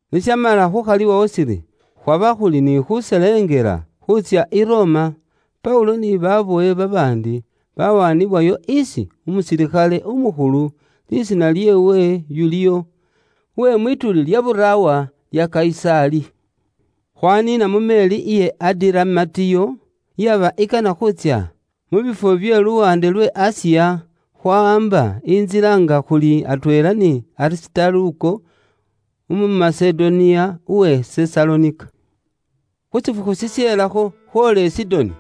Ni shamala khuukhaliwawo shiri khwaba khuli ni khuselengela khuutsya mu Itali, Paulo ni babowe babaandi bawaanibwayo isi umusilikhale umukhulu, lisiina lyeewe Yuliyo, uwe mwituuli lya buraawa lya Kayisaali. Khwaniina mu meeri iye Adiramatiyo, iyaba ikana khutsya mu bifwo bye luwaande lwe Asiya, khwawaamba intsila nga khuli atweela ni Arisitaluko, umu Masedoniya uwe Sesalonika. Khu shifukhu shishelakho, khwoola i Sidoni.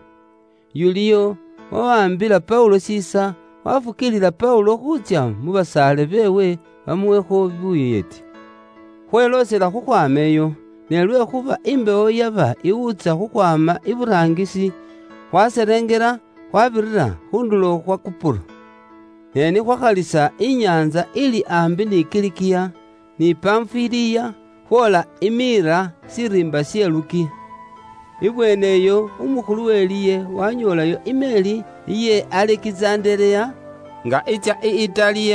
Yuliyo wawaambila Paulo shiisa, wafukiilila Paulo khuutsya mu basaale beewe bamuwekho buyeeti. Khweloosela khukhwaama iyo, ne lwekhuuba imbewo yaba iwuutsa khukhwaama iburaangisi, khwaselengela khwabirira khu ndulo khwa Kupuro. Ne ni khwakhalisa inyaantsa ili aambi ni Kilikiya, ni Panfiliya, khwoola i Miira shiriimba she Lukiya. Ibweeneyo umukhulu we liye wanyoolayo imeeri iye Alekizandereya, nga itsya i Itali,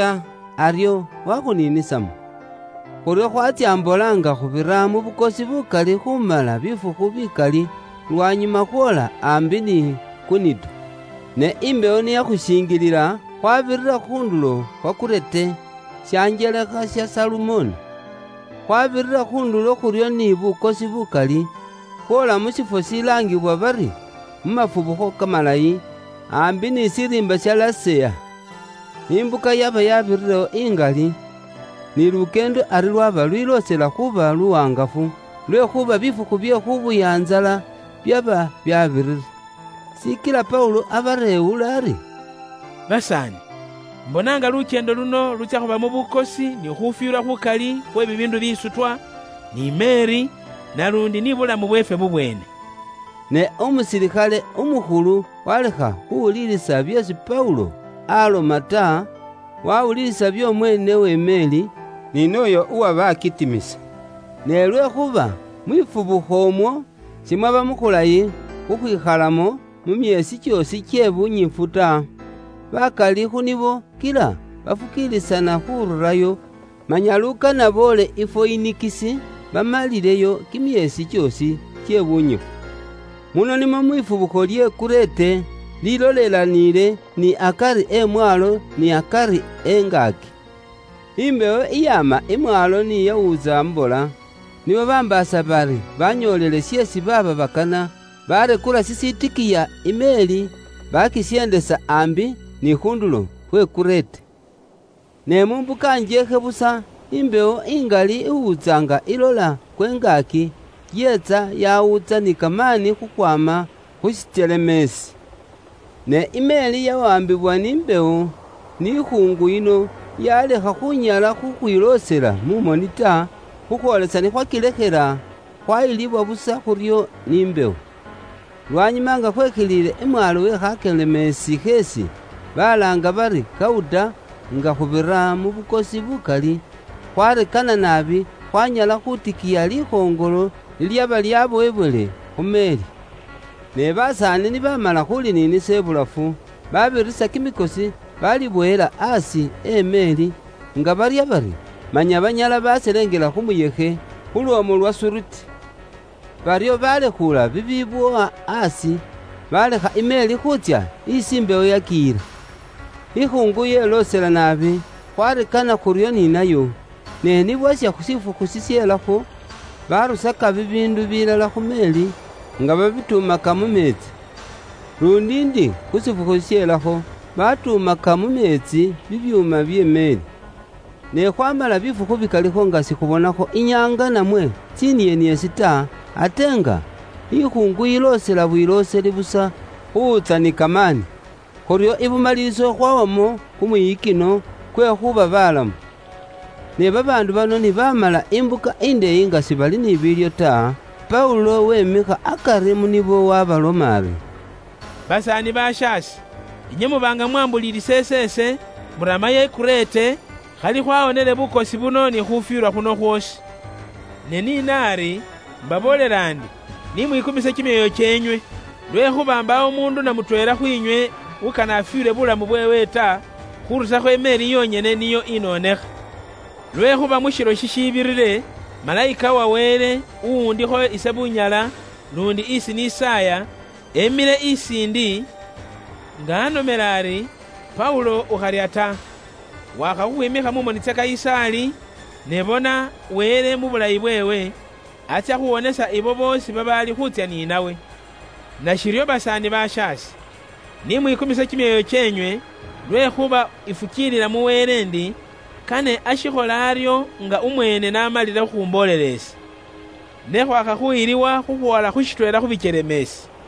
aryo wakhuniinisamo. Khuryo khwatsya mbola nga khubira mu bukosi bukali khumala bifukhu bikali, lwanyuma khwoola aambi ni Kunido. Ne imbewo ni yakhushingilila, khwabirira khu ndulo khwa Kurete, shanjelekha sha Salumone. Khwabirira khu ndulo khuryo ni bukosi bukali, khwoola mu shifwo shilaangibwa bari mu Mafubukho Kamalayi, aambi ni shiriimba sha Laseya. Imbuka yaba yabirirewo ingali, ni lukyeendo ari lwaba lwiloosela khuuba luwaangafu, lwekhuuba bifukhu bye khubuya ntsala byaba byabirire. Shikila Paulo abareewula ari, “Basaani, imbona nga lukyeendo luno lutsya khubamo bukosi ni khufwilwa khukali khwe bibiindu bisutwa, ni meeri, naluundi ni bulamu bweefwe bubweene.” Ne umusilikhale umukhulu walekha khuwulilisa byeesi Paulo aloma ta, wawulilisa by'omweene we meeri, ni nooyo uwaba alitimisa. Ne lwekhuuba mwifubukho umwo simwaba mukhulayi khukhwikhalamo mu myeesi kyoosi kye bunyifu ta, bakali khu nibo kila bafukiilisana khururayo manya lukana boole i Foyinikisi, bamalileyo kimyeesi kyoosi kye bunyifu. Muno nimwo mwifubukho lye Kurete, lilolelaniile ni akari emwaalo ni akari engaaki. Imbewo iyaama imwaalo ni yawuutsa mbola, nibo bambaasa bari banyoolile sheesi baaba bakana, barekula shishitikiya i meeri, bakisyendesa aambi ni khu ndulo khwe Kurete. Ne mu mbuka njeekhe busa, imbewo ingali iwuutsa nga ilola kwe ngaaki, yeetsa yawuutsa ni kamaani khukhwaama khu shikyelemeesi. Ne imeeri yawaambibwa ni mbewo, ni khuungu yino yalekha khunyala khukhwiloosela mu moni ta, khukhwoolisa ni khwakilekhela, khwayilibwa busa khuryo ni mbewo. Lwanyuma nga khwekhilile imwaalo we khakyelemeesi kheesi balaanga bari Kauda nga khubira mu bukosi bukali, khwarekana naabi khwanyala khutikiya likhoŋolo lilyaba lyabowebwele khu meeri. Ne basaani ni baamala khuliniinisa ibulafu, babirisa kimikosi balibowela aasi e meeri, nga barya bari, manya banyala baselengela khu muyekhe, khu lwoomu lwa Suriti. Baryo balekhuula bibibowa aasi, balekha imeeri khuutsya isi imbewo yakiyila. Ikhuungu yeloosela naabi, khwarekana khuryo ni nayo, ne ni bwasha shifukhu shishelakho, barusaka bibiindu bilala khu meeri, nga babitumaka mu meetsi. Luundi ndi khu shifukhu shishelakho, batuumaka mu meetsi bibyuuma bye meeri. Ne khwamala bifukhu bikalikho nga sikhubonakho inyaanga namwe tsinieniesi ta, ate nga ikhuungu yiloosela bwilooseli busa khuwutsa ni kamaani. Khuryo ibumaliliso khwawamo kumwiyikino kwe khuuba balamu. Ne babaandu bano ni baamala imbuka indeeyi nga sibali ni biilyo ta, Paulo wemikha akari mu nibo waabaloma ari, “Basaani bashaase, inywe muba nga mumwambuulilisa iseese, muramayo i Kurete, khali khwawonele bukosi buno ni khufwilwa khuno khwoosi. Ne ni naari, imbaboolela ndi, ni mwikumise kimyoyo kyeenywe, lwekhuuba mbaawo umuundu na mutweela khwiinywe ukana afwiilwe buulamu bweewe ta, khurusakho imeeri yonyene niyo inonekha. Lwekhuuba mu shilo shishibirire, malayika uwa Wele, uwundikho ise bunyala luundi isi nisaaya, emile isiindi, nga anomela ari, ‘Paulo ukharya ta, wakha khukhwimikha mu moni tsa Kayisaali, ne bona, Wele mu bulayi bweewe, atsya khuwonesa ibo boosi babaali khuutsya ni nawe.’ Nashiryo basaani bashaase, ni mwikumise kimyoyo kyeenywe, lwekhuuba ifukiilila mu Wele ndi, kane ashikhole aryo nga umweene n'amalile khukhumboolela ise. Ne khwakha khuyiliwa khukhwoola khu shitweela khu bikyelemeesi.”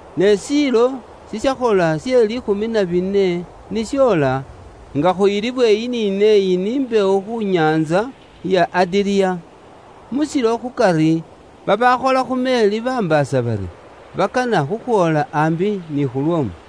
Ne shiilo shishakhola she liikhumi na bine ni shoola, nga khuyilibwa eyi ni neeyi ni mbewo khu nyaantsa ya Adiriya, mu shilo khukari, babaakhola khu meeri bambaasa bari, bakana khukhwoola aambi ni khu lwoomu.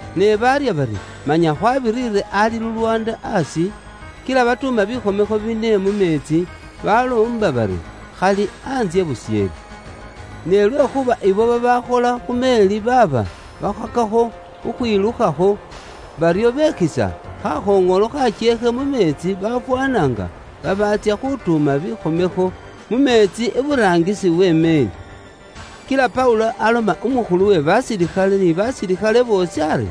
Ne baarya bari manya isi babiriire waliwo lulwaanda aasi, kila batuuma kimitsangi kine mu meetsi, baloomba bari khali antsye busheele. Ne lwekhuuba ibo babaakhola khu meeri baaba bakhakakho khukhwilukhakho, baryo bekhisa khakhoŋolo khakyeekhe mu meetsi bafwaana nga babaatsya khutuuma kimitsangi mu meetsi iburaangisi we meeri. Kila Paulo aloma umukhulu we basilikhale ni basilikhale boosi ari,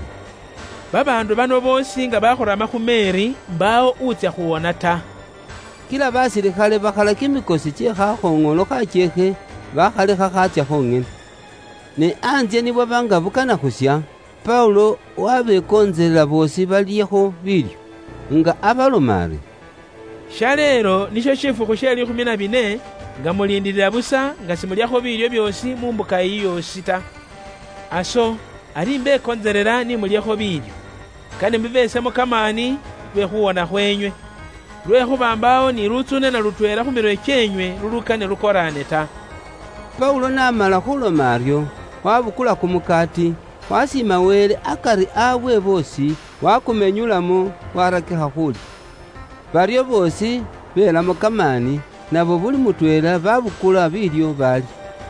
“Babaandu bano boosi nga bakhurama khu meeri ta, imbaawo utsya khuwona ta.” Kila basilikhale bakhala kimikosi kye khakhoŋolo khakyeekhe bakhalekha khaatsya khonyene. Ne antsye ni bwaba nga bukana khuusha, Paulo wabekontselela boosi balyekho biilyo, nga abaloma ari, “Shaleelo nisho shifukhu she liikhumi na bine nga muliindilila busa nga simulyakho biilyo byoosi mu mbuka iyi yoosi ta. Aso ari imbekontselela ni mulyekho biilyo. Kane bibesemo kamaani nio inywe muramewo nga mushiili balamu, lwekhuuba mbaawo ni lutsuune na lutweela khu mirwe kyeenywe lulukane lukoraane ta.” Paulo n'amala khuloma aryo, wabukula kumukaati, wasiima Wele akari waabwe boosi, wakumenyulamo, warakikha khuulya. Baryo boosi belamo kamaani, nabo buli mutweela babukula biilyo baalya.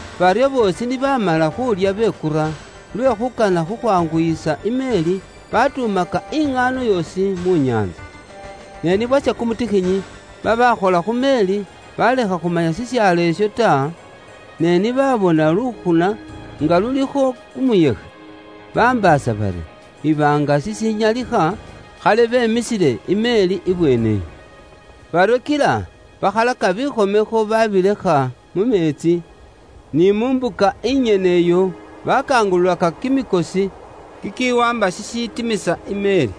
Baryo boosi ni baamala khuulya bekura, lwe khuukana khukhwanguyisa i meeri, batuumaka iŋaano yoosi mu nyaantsa. Ne ni bwasha kumutikhinyi, babaakhola khu meeri balekha khumanya shishaalo isho ta, ne ni baabona lukhuna nga lulikho kumuyekhe, bambaasa bari iba nga shishinyalikha khali bemisile i meeri ibweene iyo. Baryo kila bakhalaka kimitsangi bakilekha mu meetsi, ni mu mbuka inyene iyo bakangululaka kimikosi kikiwaamba shishitimisa i meeri.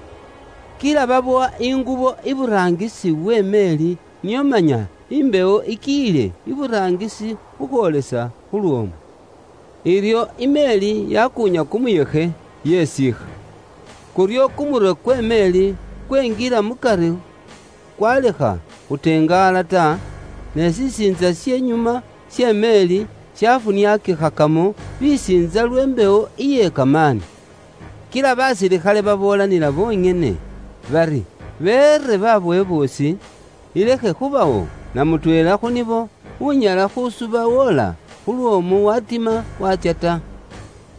Kila babowa ingubo iburaangisi we meeri nio manya imbewo ikiyile iburaangisi khukhwoolesa khu lwoomu. Iryo i meeri yakuunya kumuyekhe, yesiikha. Kuryo kumurwe kwe meeri kwenjila mu kari kwalekha khuteengala ta, ne shisiintsa she nyuma she meeri shafuniakikhakamo bisiintsa lwe mbewo iye kamaani. Kila basilikhale baboolanila bonyene bari beere babowe boosi, ilekhe khubawo na mutweela khu nibo unyala khusuba woola khu lwoomu watima waatsya ta.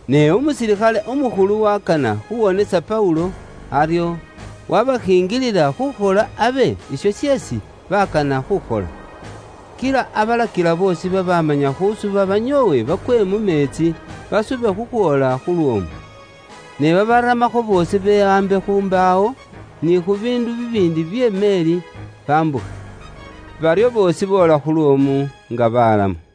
Ne umusilikhale umukhulu wakana khuwonesa Paulo, aryo wabashinjilila khukhola abe isho sheesi baakana khukhola. Kila abalakila boosi babamanya khusuba banyoowe bakwe mu meetsi, basube khukhwoola khu lwoomu. Ne babaramakho boosi bewaambe khu mbaawo, ni khu biindu bibiindi bye meeri bambukhe. Baryo boosi boola khu lwoomu nga balamu.